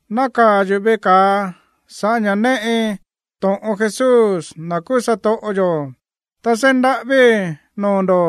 Nákaa̱ yuꞌu̱ veꞌe ka̱a sa̱ꞌá ña̱ néꞌi to̱ꞌon Jesús, na̱ kuu satoꞌo yo̱, ta seí ndaꞌávíi̱ noo̱ ndo̱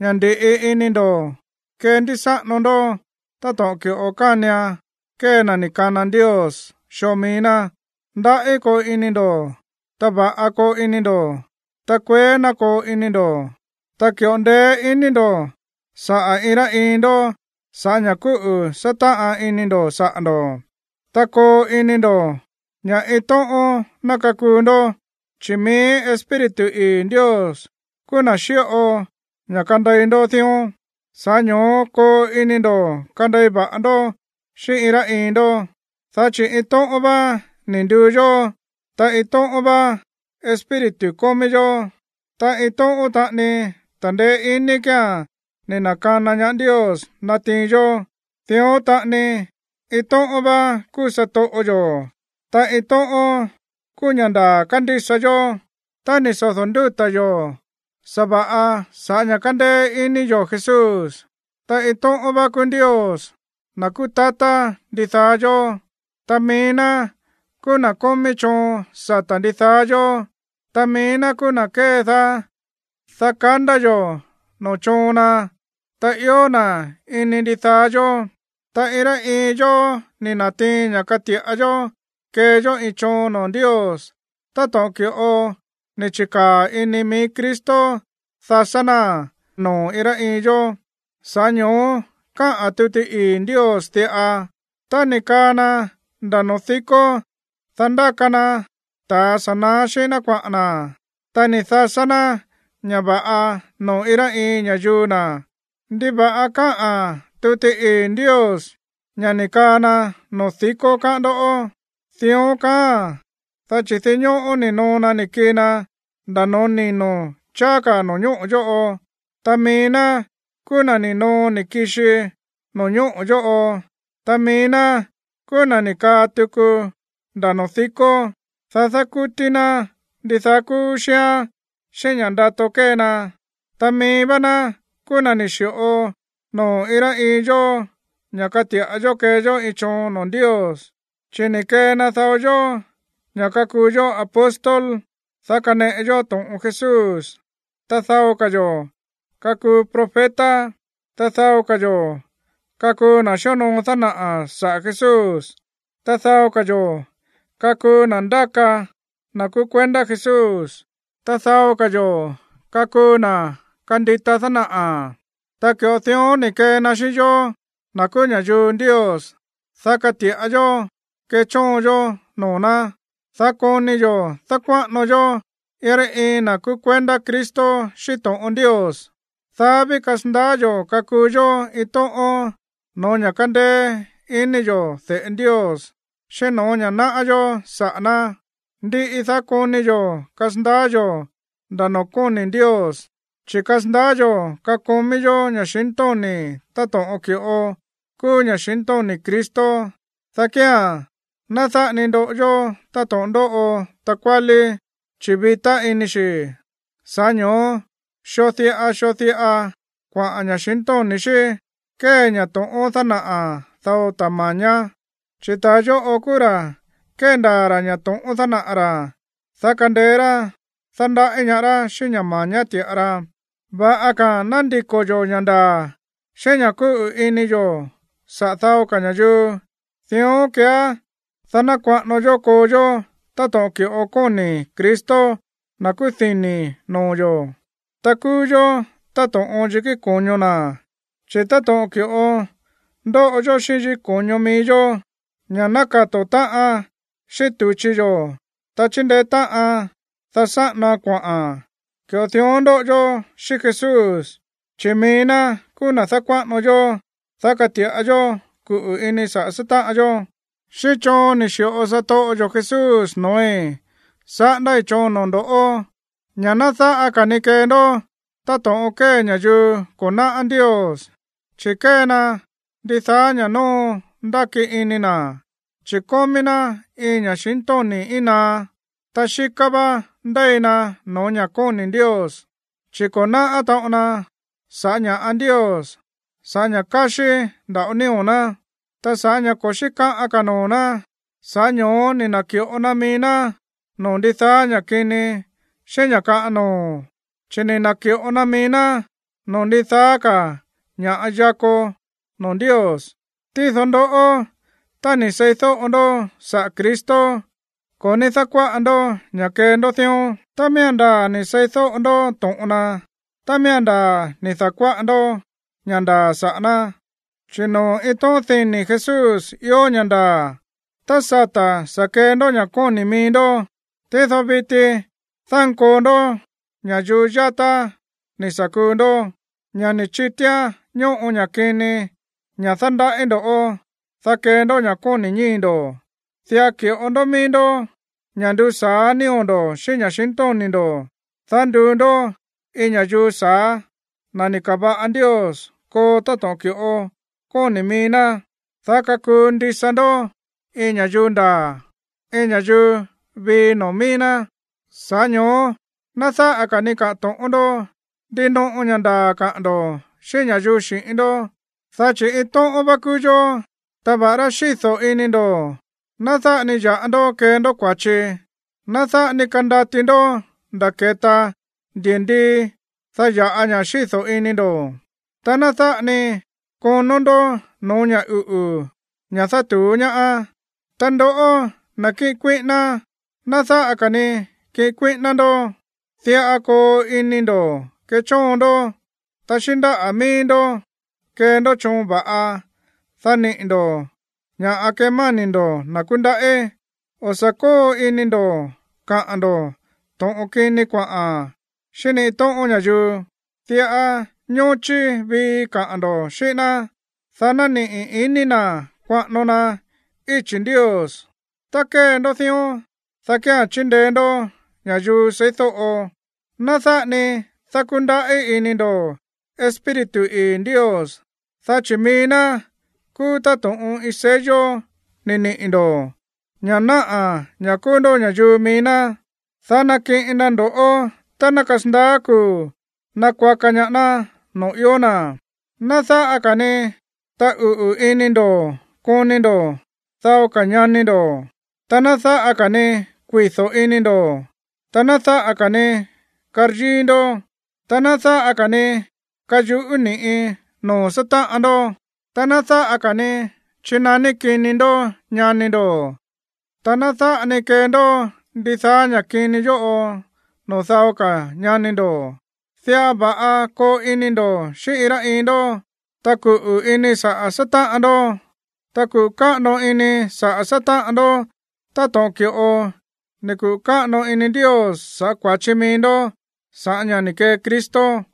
ña̱ ndi̱ꞌi ini ndo̱ kendísáꞌano ndó táto̱ꞌon ki̱ꞌo kánian kee na̱ ni̱ kana Ndios xoo mií ná. Ndaꞌí koo ini ndo̱, ta va̱ꞌa koo ini ndo̱, ta kueé ná koo ini ndo̱, ta ki̱ꞌo ndeé iní ndo̱ saꞌa̱ iin rá iin ndó sa̱ꞌá ña̱ kúꞌu̱ sátáꞌan ini ndo̱ saꞌa̱ ndo̱. Ta koo ini ndo̱ ña̱ iin tóꞌón ná kakuu ndó, chi̱ mií Espíritu ii̱ Ndios kúú na̱ xíꞌo ña̱ kandei ndó dión, sa̱ꞌá ño̱ó koo ini ndo̱ kandei va̱ꞌa ndó xíꞌín iin rá iin ndó. Dá chi̱ iin tóꞌón vá ni̱ nduu yó, ta iin tóꞌón vá Espíritu kómí yó, ta iin tóꞌón taꞌani ta̱ndeé iní kía̱n ni̱ na̱kana ñaá Ndios natiin yó. Dión taꞌani iin tóꞌón vá kúú satoꞌo yo̱, ta iin tóꞌón kúú ña̱ ndaa̱ kándísa yó, ta ni̱ sodo̱ ndúta̱ yo̱ sa̱va̱ꞌa sa̱ꞌá ña̱ kándéé iní yo̱ Jesús, ta iin tóꞌón vá kúú Ndios, na̱ kúú tatá ndidaá yó. Ta mií ná kúú na̱ kómí choon sata̱ ndidaá yó, ta mií ná kúú na̱ kédaá, dá kandá yo̱ noo̱ choon na, ta ió na̱ ini ndidaá yó. Ta iin rá iin yó ni̱ na̱tiin ña̱ kati̱ꞌa yó kee yó iin choon noo̱ Ndios táto̱ꞌon ki̱ꞌo ni̱ chi̱kaa̱ ini mií Cristo dasá náa̱n noo̱ iin rá iin yó. Sa̱ꞌá ño̱ó káꞌa̱n tuti ii̱ Ndios diꞌa: Tá ni̱ kaa na nda̱ noo̱ díkó, dá ndáka na ta̱a sa̱ na̱á xíꞌín ná kuaꞌa̱n na̱. Ta ni̱ dasá ná ña̱ va̱ꞌa noo̱ iin rá iin ña̱yuu na̱. ¿Ndiva̱ꞌa káꞌa̱n tuti ii̱ Ndios ña̱ ni̱ kaa na noo̱ díkó, káꞌán ndó? Dión kaáa̱n, dá chi̱ dinñóꞌó ni̱ noo na ni̱ kii na nda̱ noo̱ nino̱ cháá ka̱ no̱ñóꞌo̱ yóꞌo. Ta mií ná kúú na̱ ni̱ noo ni̱ kixi no̱ñóꞌo̱ yóꞌo, ta mií ná kúú na̱ ni̱ kaa tuku nda̱ noo̱ díkó, dá dákútí ná ndidaá kúú xíán xíꞌín ña̱ ndato kée na. Ta mií vá ná kúú na̱ ni̱ xi̱ꞌo noo̱ iin rá iin yó ña̱ kati̱ꞌa yó kee yó iin choon noo̱ Ndios, chi̱ ni̱ kee na dao yó ña̱ kakuu yó apóstol, dá kaneꞌe yó to̱ꞌon Jesús, ta dao ka̱ yo̱ kakuu profeta, ta dao ka̱ yo̱ kakuu na̱ xíonoo dánaꞌa̱ saꞌa̱ Jesús, ta dao ka̱ yo̱ kakuu na̱ ndáka na̱ kúú kuendá Jesús, ta dao ka̱ yo̱ kakuu na̱ kandita dánaꞌa̱. Ta ki̱ꞌo dión ni̱ kee na xíꞌín yóó, na̱ kúú ña̱yuu Ndios, dá kati̱ꞌa yó kechóon yó noo̱ ná, dá koni yo̱ dákuáꞌano yó iin rá iin na̱ kúú kuendá Cristo xíꞌín to̱ꞌon Ndios, dá ví kasandaá yo̱ kakuu yó iin tóꞌón no̱ó ña̱ kándéé iní yo̱ de̱ꞌe Ndios, xíꞌín no̱ó ña̱ náꞌá yó saꞌa̱ ná. Ndiꞌi, dá koni yo̱ kasandaá yo̱ nda̱ noo̱ kóni̱ Ndios, chi̱ kasandaá yo̱ kakomí yó ña̱xintóni̱ táto̱ꞌon ki̱ꞌo kúú ña̱xintóni̱ Cristo. Dá kía̱n, ná dáꞌa ni ndoꞌo yó táto̱ꞌon ndóꞌo takuálí, chi̱ vitá ini xi̱, sa̱ꞌá ño̱ó xoo diꞌa xoo diꞌa kuaꞌa̱n ña̱xintóni̱ xí kée ña̱ to̱ꞌón dánaꞌa̱ dao ta̱ ma̱ñá. Chi̱ ta̱a yóꞌo kúú ra̱ kéndaa̱ ra̱ ña̱ to̱ꞌón dánaꞌa̱ ra̱, dá kandeé rá dándaꞌí ñaá rá xíꞌín ña̱ ma̱ñá ti̱ꞌa ra. Va̱ꞌa ka̱a̱n ná ndiko̱ yo̱ ña̱ ndaa̱ xíꞌín ña̱ kúꞌu̱ ini yo̱ saꞌa̱ dao ka̱ ña̱yuu, dión keeá, dá ná kuaꞌano yó koo yó táto̱ꞌon ki̱ꞌo kóni̱ Cristo, na̱ kúú dini̱ noo̱ yo̱. Ta kúú yó táto̱ꞌon yikí ko̱ño na̱. Chi̱ táto̱ꞌon ki̱ꞌo ndóꞌo yó xíꞌín yikí ko̱ño mií yó, ña̱ nákato̱ táꞌan xíꞌín tu̱chi yo̱, ta chíndeé táꞌan, dá sáꞌanoan kuaꞌa̱n, ki̱ꞌo dión ndóꞌo yó xíꞌín Jesús, chi̱ mií ná kúú na̱ dákuáꞌano yó, dá kati̱ꞌa yó kuꞌu̱ ini saꞌa̱ sátáꞌan yó. Xíꞌín choon ni̱ xi̱ꞌo satoꞌo yo̱ Jesús no̱ói̱, saꞌándái̱ choon noo̱ ndo̱ ña̱ ná dáꞌa ka̱ ni kee ndó táto̱ꞌon kée ña̱yuu ko̱ náꞌá Ndios, chi̱ kée na ndidaá ña̱ nóo ndáki ini na̱, chi̱ kómí ná iin ña̱xintóni̱ íin naá, ta xíká vá ndéi na no̱ó ña̱ kóni̱ Ndios, chi̱ ko̱ náꞌá taꞌon na sa̱ꞌá ña̱ꞌa Ndios sa̱ꞌá ña̱ káxí nda̱ꞌo nío̱ ná. Ta sa̱ꞌá ña̱ ko̱ xíkaꞌan ka̱ noo̱ ná, sa̱ꞌá ño̱ó ni̱ na̱ki̱ꞌo na mií ná noo̱ ndidaá ña̱ kini xíꞌín ña̱ kaꞌan noo̱, chi̱ ni̱ na̱ki̱ꞌo na mií ná noo̱ ndidaá ka̱ ña̱ yakó noo̱ Ndios. Tído ndoꞌó, tá ni̱ seídóꞌo ndó saꞌa̱ Cristo, ko̱ ní dákuáꞌa ndó ña̱ kee ndó dión tá miía̱n ndaa̱ ni̱ seídóꞌo ndó to̱ꞌon na, tá miía̱n ndaa̱ ni̱ da̱kuáꞌa ndó ña̱ ndaa̱ saꞌa̱ ná, chi̱ noo̱ iin tóꞌón dini̱ Jesús ió ña̱ ndaa̱. Tá sata̱ sa̱ kee ndó ña̱ kóni̱ mií ndó, tído viti dánkoo ndó ña̱yuu yátá ni̱ sa̱ kuu ndó, ña̱ ni̱ chitíán ñóꞌo ña̱ kini, ña̱ dándaꞌí ndo̱ꞌó, dá kee ndó ña̱ kóni̱ ñíi̱ ndo̱. Diꞌa ki̱ꞌo ndó mií ndó ña̱ ndusa̱á nío̱ ndo̱ xíꞌín ña̱xintóni̱ ndo̱, dá nduu ndó iin ña̱yuu sa̱á, na̱ ni̱ ka̱va̱ꞌa Ndios koo táto̱ꞌon ki̱ꞌo kóni̱ mií ná, dá kakuu ndisa ndó iin ña̱yuu ndaa̱, iin ña̱yuu vii noo̱ míí ná. Sa̱ꞌá ño̱ó ná dáꞌa ka̱ ni kaꞌa̱n to̱ꞌón ndó, ndinoꞌo ña̱ ndaa̱ kaꞌa̱n ndo̱ xíꞌín ña̱yuu xi̱ꞌín ndó, dá chi̱ iin tóꞌón vá kúú yó. Ta va̱ꞌará xído̱ ini ndo̱, ná dáꞌa ni ya̱ꞌa ndó kee ndó kua̱chi. Ná dáꞌa ni kandati ndó nda̱ keta ndi̱ndii, dá ya̱ꞌa ña̱ xído̱ ini ndo̱, ta ná dáꞌa ni konó ndó no̱ó ña̱ uꞌu̱ ña̱ dátu̱ú ñaá. Ta ndoꞌó, na̱ kíꞌin kuíꞌíná, ná dáꞌa ka̱ ni kiꞌin kuíꞌíná ndó. Diꞌa koo ini ndo̱ kechóon ndó, ta xíꞌín ndáꞌa̱ míí ndó kee ndó choon va̱ꞌa, dá niꞌi̱ ndo̱ ña̱ꞌa kemáni̱ ndo̱ na̱ kúndaꞌí. O̱ sa̱ kóo ini ndo̱ kaꞌa̱n ndo̱ to̱ꞌon kini kuaꞌa̱n xíꞌín ni iin tóꞌón ña̱yuu. Diꞌa ñóchí vii kaꞌa̱n ndo̱ xíꞌín ná, dá ná niꞌi̱ iní na̱ kuaꞌano na íchi̱ Ndios. Tá kee ndó dión, dá kía̱n chindeé ndó ña̱yuu seídóꞌo. Ná dáꞌa ni dákúndaꞌí iní ndo̱ Espíritu ii̱ Ndios, dá chi̱ mií ná kúú táto̱ꞌon iin sello ni̱ niꞌi̱ ndo̱, ña̱ náꞌa̱ ña̱ kúú ndó ña̱yuu mií ná, dá nakiꞌin na ndo̱ꞌó tá ná kasandaá kuu̱ nakuaka ñaá ná noo̱ ió na̱. Ná dáꞌa ka̱ ni taꞌuꞌu̱ ini ndo̱ koni ndo̱ dao ka̱ ñani ndo̱, ta ná dáꞌa ka̱ ni kuido̱ ini ndo̱, ta ná dáꞌa ka̱ ni karyíí ndó, ta ná dáꞌa ka̱ ni kayuꞌú ni̱ꞌi noo̱ sátáꞌan ndó, ta ná dáꞌa ka̱ ni chinaní kini ndó ñani ndo̱, ta ná dáꞌa ni kee ndó ndidaá ña̱ kini yóꞌo noo̱ dao ka̱ ñani ndo̱. Diꞌa va̱ꞌa koo ini ndo̱ xíꞌín iin rá iin ndó, ta kuꞌu̱ ini saꞌa̱ sátáꞌan ndó, ta kuꞌu̱ káꞌano ini saꞌa̱ sátáꞌan ndó táto̱ꞌon ki̱ꞌo ni̱ kuꞌu̱ káꞌano ini Ndios sa̱ꞌá kua̱chi mií ndó sa̱ꞌá ña̱ ni̱ kee Cristo.